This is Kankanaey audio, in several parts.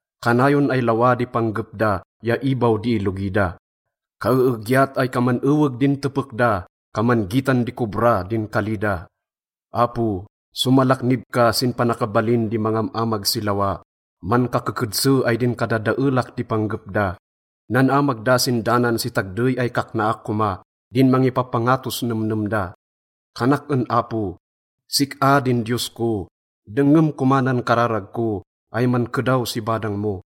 Kanayon ay lawa di panggep da ya ibaw di ilogi da. Kaeegyat ay kaman eweg din tepek da, kaman gitan di kobra din kali da. Apo, somalaknib ka sin panakabalin di mangam-amag si lawa, mankakekedse ay din kadadaelak di panggep da. Nan-amag da sin danan si tagdey ay kaknaak koma din mangipapangatos nemnem da. Kanak en Apo: Sik-a din Diyos ko, dengngem koma nan kararag ko ay mankedaw si badang mo.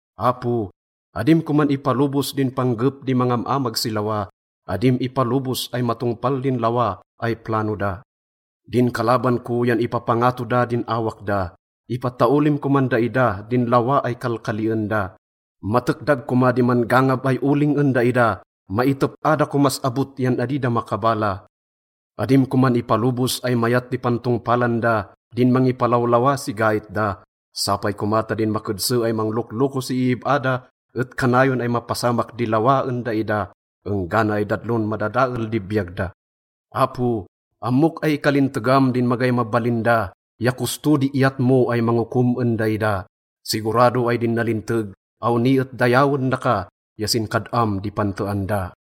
Apo, adim koman ipalobos din panggep di mangam-amag si lawa, adim ipalobos ay matongpal din lawa ay plano da. Din kalaban ko yan ipapangato da din awak da, ipataolim koman daida din lawa ay kalkalien da. Matekdag koma di man-gangab ay oling en daida, maitep-a da komas abot yan adi da makabala. Adim koman ipalobos ay mayat di pantongpalan da din mangipalawlawa si gait da. Sapay koma ta din makedse ay manglokloko si iib-a da et kanayon ay mapasamak di lawa en daida enggana ay dadlon madadael di biyag da. Apo, ammok ay ikalintegam din magay mabalin da ya kosto di iyat mo ay mangokom en daida. Sigurado ay din nalinteg, awni et dayawen daka ya sin kad-am di pantean da.